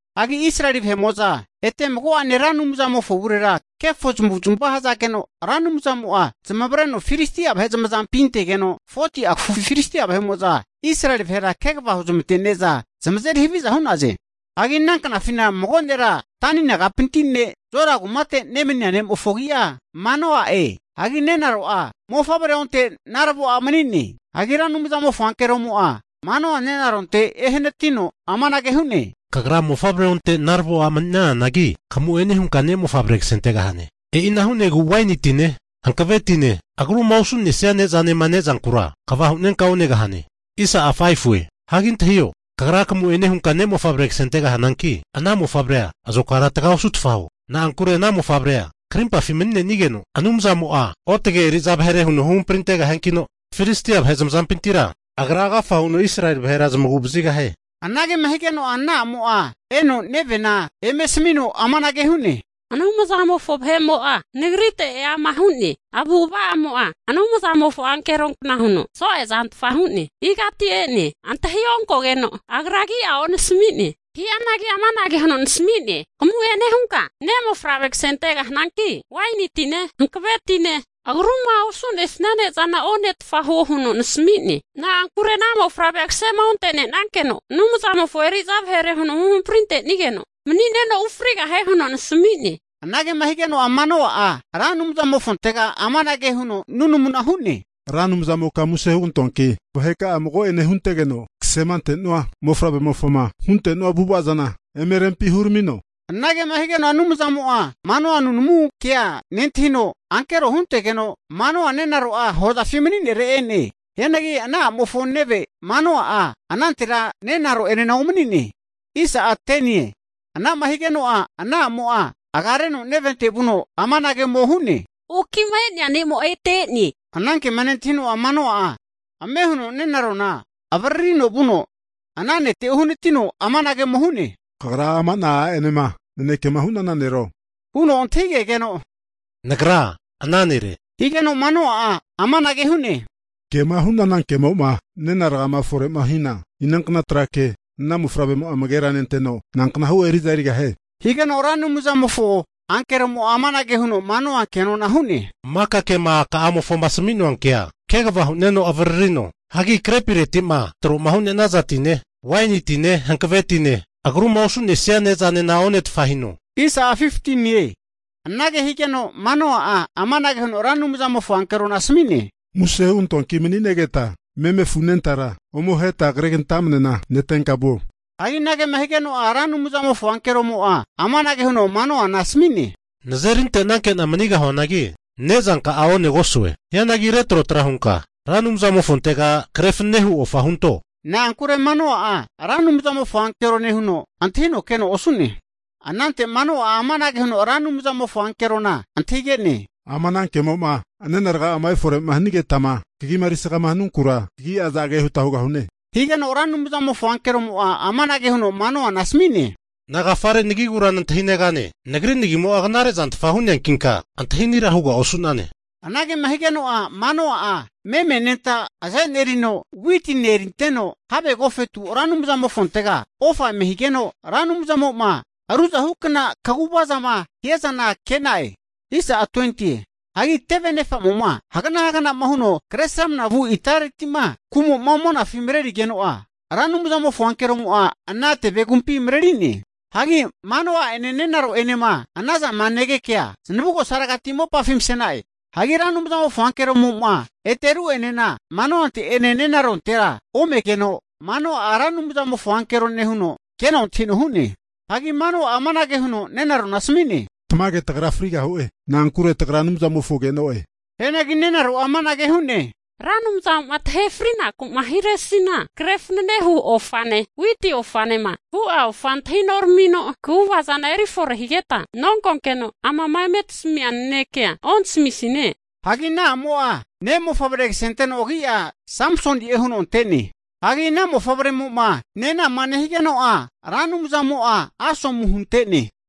Hagi Israeli vahe'mo'za ete mago'ane Ra Anumzamofo avurera kefo zamavu'zmava hazageno, Ra Anumzamo'a zamavareno Filistia vahe zamazampi zamantegeno, 40'a kafufi Filistia vahe'mo'za Israeli vahera kegava huzamante'ne'za zamazeri haviza hu'naze. Hagi ana knafina mago nera Dani nagapinti ne' Zora kumate nemania ne'mofo agi'a Manoa'e. Hagi nenaro'a mofavre onte naravo a' mani'ne. Hagi Ra Anumzamofo ankeromo'a Manoa nenaronte ehanatino amanage hu'ne, kagra Mofavrea onte naravo a' mani'nananagi, kamu'ene hunka ne' mofavre kasentegahane. E'ina hu'negu waini tine, hankave tine, agruma osu'nesia ne'zanema ne'zankura kva hu'nenka onegahane. Hagi antahio, kagra kamu'ene hunka ne' mofavre kasente'gahananki, ana mofavrea azokara taga osutfa huo. Na'ankure ana mofavrea krimpafi mani'negeno, Anumzamo'a otage eri'za vahere huno huhamprintegahiankino, Filistia vahe zamazampintira agra agafa huno Israeli vahera zamagu'vazigahie. Anagema higeno'a ana a'mo'a eno nevena eme asamino amanage hu'ne, Anumzamofo vahe'mo'a nagrite eama hu'ne! Avu'ava'amo'a Anumzamofo ankeronkna huno so'e zantfa hu'ne. Igati e'ne, antahionkogeno agra agi'a onasami'ne. Hianagi amanage huno nasami'ne, kamu'ene hunka ne' mofavre kasentegahananki, waini tine, hankave tine, agruma osu'nesia ne'zanena onetfa huo huno nasami'ne. Na'ankure ana mofavrea kasema onte'nenankeno'a Anumzamofo eri'za vahere huno huhamprinte'nigeno mani'neno ufrigahie huno nasami'ne. Anagema higeno'a Manoa'a Ra Anumzamofontega amanage huno nunamuna hu'ne, Ra Anumzamoka muse hugantoanki, vaheka'a mago'ene huntegeno kasemantenu'a mofavremofoma hunte'nua avu'ava zana eme rempi huramino. Anage higeno Anumzamo'a Manoa nunamu kea nentahino, ankero'a huntegeno Manoa nenaro'a hozafi mani'nere e'ne. Hianagi ana a'mofo neve Manoa'a anantera nenaro'enena omani'ne. Ana'ma higeno'a, ana a'mo'a agareno nevente vuno amanage ome hu'ne, Oki'ma e'nea ne'mo'a ete e'ne. Higeno ana kema nentahino'a Manoa'a ame huno nenarona avaririno vuno ana nete uhanatino amanage ome hu'ne, Kagra ama'na a'enema nanekema hu'nana nero? huno antahigegeno, Nagra ana nere. Higeno Manoa'a amanage hu'ne, Kema hu'nana kemo'ma nena rgama fore'ma hina, inankna tra ke ana mofavremo'a amagera nenteno, nanknahu eri'za erigahie? Higeno Ra Anumzamofo ankeromo'a amanage huno Manoa ke'nona hu'ne, Maka kema aka'amofoma asami'noa kea kegava hu'neno avararino. Hagi krepireti'ma tro'ma hanaza tine, waini tine, hankave tine, agruma osu'nesia ne'zanena onetfa hino. Anage higeno, Manoa'a amanage huno Ra Anumzamofo ankerona asami'ne, Muse hugantoanki mani'negeta meme afu anentara ome aheta kregantamnena netenka vuo. Hagi anagema higeno'a Ra Anumzamofo ankeromo'a amanage huno Manoana asami'ne, Nazerinte'nankena manigahuanagi, nezanka'a onegosue. Hianagi retrotra hunka Ra Anumzamofontega kre fananehu ofa hunto. Na'ankure Manoa'a Ra Anumzamofo ankerone huno antahino keno osu'ne. Anante Manoa'a amanage huno Ra anumzamofo ankerona antahige'ne? Ama ana kemo'ma nena raga'a efore'ma hanigetama kagima erisgama hanunkura, kagi'a azage huta ahegahue? Higeno Ra Anumzamofo ankeromo'a amanage huno Manoana asami'ne, Nagafare nagigura nantahinegane? Nagri nagimo'a knarezantfa hu'neankinka, antahi ani hugara osu'nane. Anagema higeno'a Manoa'a meme anenta azenerino, witine erinteno have agofetu Ra Anumzamofontega ofa eme higeno, Ra Anumzamo'ma ruzahukna kaguva zama hiazana ke'na'e. Hagi teve anefamo'ma hagana haganama huno Kresramanama vu itareti'ma kumo'ma monafi marerigeno'a, Ra Anumzamofo ankeromo'a ana tevegumpi mareri'ne. Hagi Manoa'ene nenaro'enema ana zama negekea zanavugosaregati mopafi mase'na'e. Hagi Ra Anumzamofo ankeromo'ma ete ru'enena Manoante'ene nenarontera omegeno, Manoa'a Ra Anumzamofo ankerone huno keno antahino hu'ne. Hagi Manoa'a amanage huno nenarona asami'ne, Tamage tagra frigahu'e. Na'ankure tagra Anumzamofo ke'no'e. Hianagi nenaro'a amanage hu'ne, Ra Anumzamo'ma tahe frinaku'ma hiresina kre fananehu ofane, witi ofanema hu'a ofa antahi noramino kaguvazana erifore higeta nonkokeno, amama eme tasamia nanekea ontasamisine. Hagi ana a'mo'a ne' mofavre kasenteno agi'a Samsoni'e huno ante'ne. Hagi ana mofavremo'ma nenama nehigeno'a, Ra Anumzamo'a asomu hunte'ne.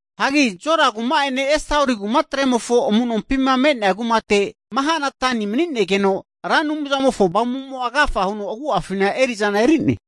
Hagi Zora kuma'ene Estaoli kumatremofo amu'nompima me'nea kumate Mahane-dani Samsoni'a mani'negeno, Ra Anumzamofo Avamu'mo'a agafa huno agu'afina eri'zana eri'ne.